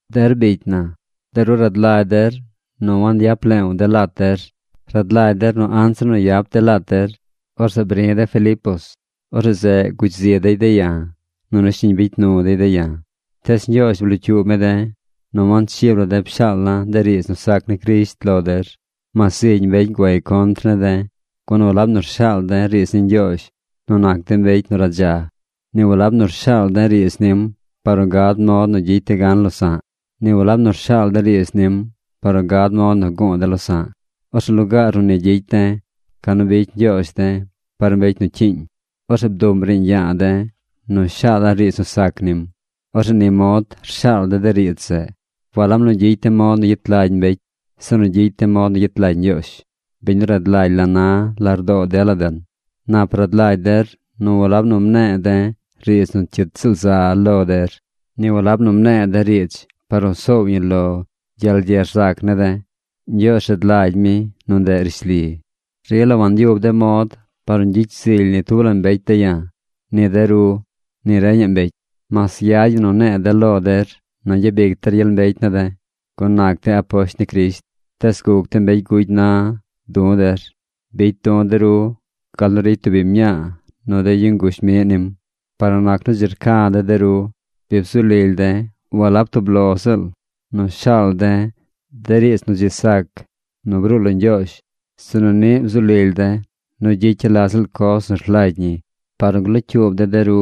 Der bicy na, de ru rad lagy der nu wangyap leew de̱ lat der. Rad lagy der nu anzir nu yap de̱ lat der, orzeꞌ bri̱ de̱ Filipos. Orzeꞌ zeꞌ gugy zi dey de̱ ya̱, nunu shiñ bicy nu dey de̱ ya̱. Tees Ñgyoozh blocyuub mi de̱ nu wanchib la de̱ pshaal la̱ de riidz nu sac ni Crisht lo der, mas zigy mbecy guay contr ne̱ de̱. Gun walab nu rshaal de̱ riidz ni Ñgyoozh nu nac de̱ mbecy nu radza. Ni walab nu rshaal de̱ riidz nim par nu gad mod nu gyicy de̱ gan losa̱ꞌ. Ni walab nu rshaal de̱ riidz nim par nu gad mod nu gu̱u̱ de̱ losa̱ꞌ. Orzeꞌ lugaar nu ni gyicy de̱, ca nu bicy Ñgyoozh de̱ par mbecy nu cyiiñ. Orzeꞌ bduꞌm riiñ ya̱a̱ de̱ nu shaala̱ riidz nu sac nim. Orzeꞌ ni mod rshaal de̱ de riidz zeꞌ. Walab nu gyicy de̱ mod nu gyet lagy mbecy, sinu gyicy de̱ mod nu gyet lagy Ñgyoozh, biñ nu rad lagy la na lardoo dela den. Nap rad lagy der nu walab nu mne̱e̱ de̱ riidz nu cyit ziꞌl za lo der. Ni walab nu mne̱e̱ de̱ riidz par nu soow ñi lo gyel ye rzac ne̱ de̱. Ñgyoozh rad lagy mi nu ndeꞌ rishli. Rila wanyub de̱ mod par nu gyicy zily ni tub la mbecy de̱ ya̱: ni de ru, ni reñaꞌ mbecy. Mas yad ñi nu ne̱e̱ de̱ lo der nu gyabic der gyel mbecy ne̱ de̱, gun nac de̱ aposht ni Crisht, tees guc de̱ mbecy gugy na du̱ der. Bicy du̱ de ru gal nu ricy tub biñ mñaa nu de yu nguzh miꞌ nim. Par nu nac nu dzi rca̱ de̱ de ru, bi bzu lily de̱ walab tub lo ziꞌl nu shaal de̱ de riidz nu dzi sac nu bruu lo Ñgyoozh, sinu niꞌ bzu lily de̱ nu gyicya̱ la ziꞌl coz nu rlagy ñi par nu glocyuub de̱ de ru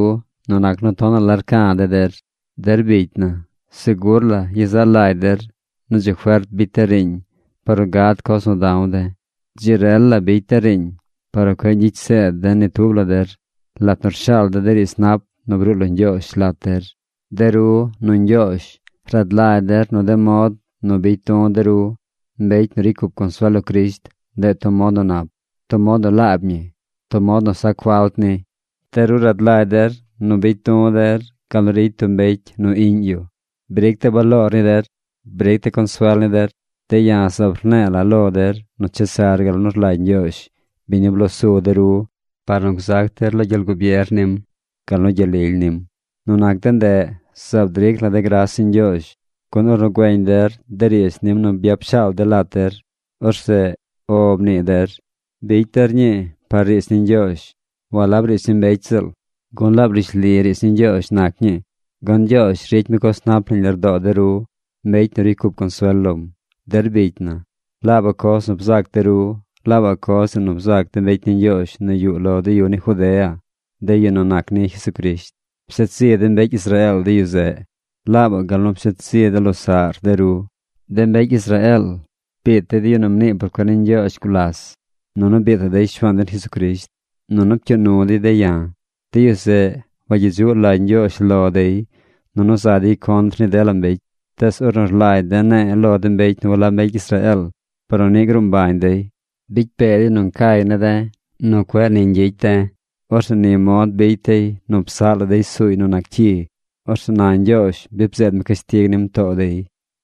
nu nac nu tonaꞌ la rca̱ de̱ der. Der bicy na, segur la yezaꞌ lagy der nu dzi fert bicy de̱ riiñ par nu gad coz nu da̱w de̱. Dzi rel la bicy de̱ riiñ par nu cueꞌ ñgyicy zeed de̱ ni tub la der lat nu rshaal de̱ de riidz nap nu bruu lo Ñgyoozh lat der. De ru, nu Ñgyoozh rad lagy der nu de mod nu bicy du̱ de ru, mbecy nu ricy cup consuel lo Crisht, ndeꞌ tub mod nu nap, tub mod nu laab ñi, tub mod nu sac falt ni. De ru rad lagy der nu bicy du̱ der gal nu ricy tub mbecy nu iꞌñ yu. Bric de̱ baloor ni der. Bric de̱ consuel ni der. De̱ ya̱ zaab rne̱e̱ la̱ lo der nu chesar gal nu rlagy Ñgyoozh, biñ nu blo su de ru par nu gzac der lo gyel gubier nim, gal nu gyel lily nim. Nu nac de ndeꞌ, zaab dric la̱ de̱ gras ni Ñgyoozh, gun ornu güeñ der de riidz nim nu byap shaal de̱ lat der, orzeꞌ “O” mnii der. Bicy der ñii par riidz ni Ñgyoozh, walab riidz ni mbecy ziꞌl, gun laab rishli riidz ni Ñgyoozh nac ñii. Gun Ñgyoozh ricy mi coz nap nañ lardoo de ru, mbecy nu ricy cup consuel lom. Der bicy na, laabaꞌ coz nu bzac de ru laabaꞌ coz zeꞌ nu bzac de mbecy ni Ñgyoozh nu yuꞌ lo de yu ni Judea, de yu nu nac ni Jesucrisht. Pshet zi de mbecy Israeel de yu zeꞌ, laabaꞌ gal nu pshet zi de losaꞌr de ru. De mbecy Israeel biit dey de yu nu mnii por cuen ni Ñgyoozh gulas, nunu biitaꞌ dey Shuaan den Jesucrisht, nunu pcyuu nu dey de̱ ya̱. De yu zeꞌ, wagyedzuꞌ lagy Ñgyoozh lo dey, nunu za dey contr ni dela mbecy. Tees ornu rlagy de̱ ne̱e̱ lo de mbecy nu walab mbecy Israeel, par nu niꞌ gruu mbañ dey, bicy pee dey nu ncay ne̱ de̱ nu cueꞌ ni ñgyicy de̱. Orzeꞌ ni mod bicy dey nu psaꞌ la dey suuy nu nac cyi. Orzeꞌ na Ñgyoozh bi bzeed mi cashtig nim too dey.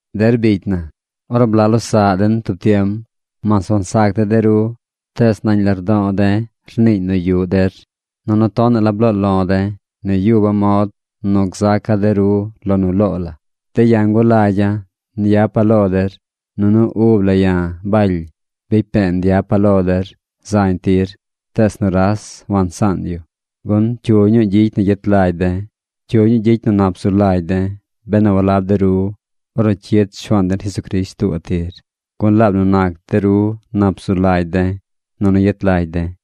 Der bicy na, ornu blaꞌ losaꞌ den tub tiem, mas wansac de̱ de ru, tees nañ lardo̱o̱ de̱ rniiñ nu yuꞌ der, nunu tonaꞌ la bloo lo̱ de̱ nu yuba̱ mod nu gzaca̱ de ru lo nu loo la. De̱ ya̱ ngulagya̱ nyapa̱ lo der. Nunu ub la ya̱, Baly, bicy pe̱e̱ nyapa̱ lo der zañ tir. Tees nuras wansaan yu. Gun ¿cyu ñuu gyicy nu yet lagy de̱? ¿Cyu ñuu gyicy nu nap zu lagy de̱ benu walab de ru ornu cyid Shuaan den Jesucrisht tuubaꞌ tir? Gun laab nu nac de ru nap zu lagy de̱, nunu yet lagy de̱.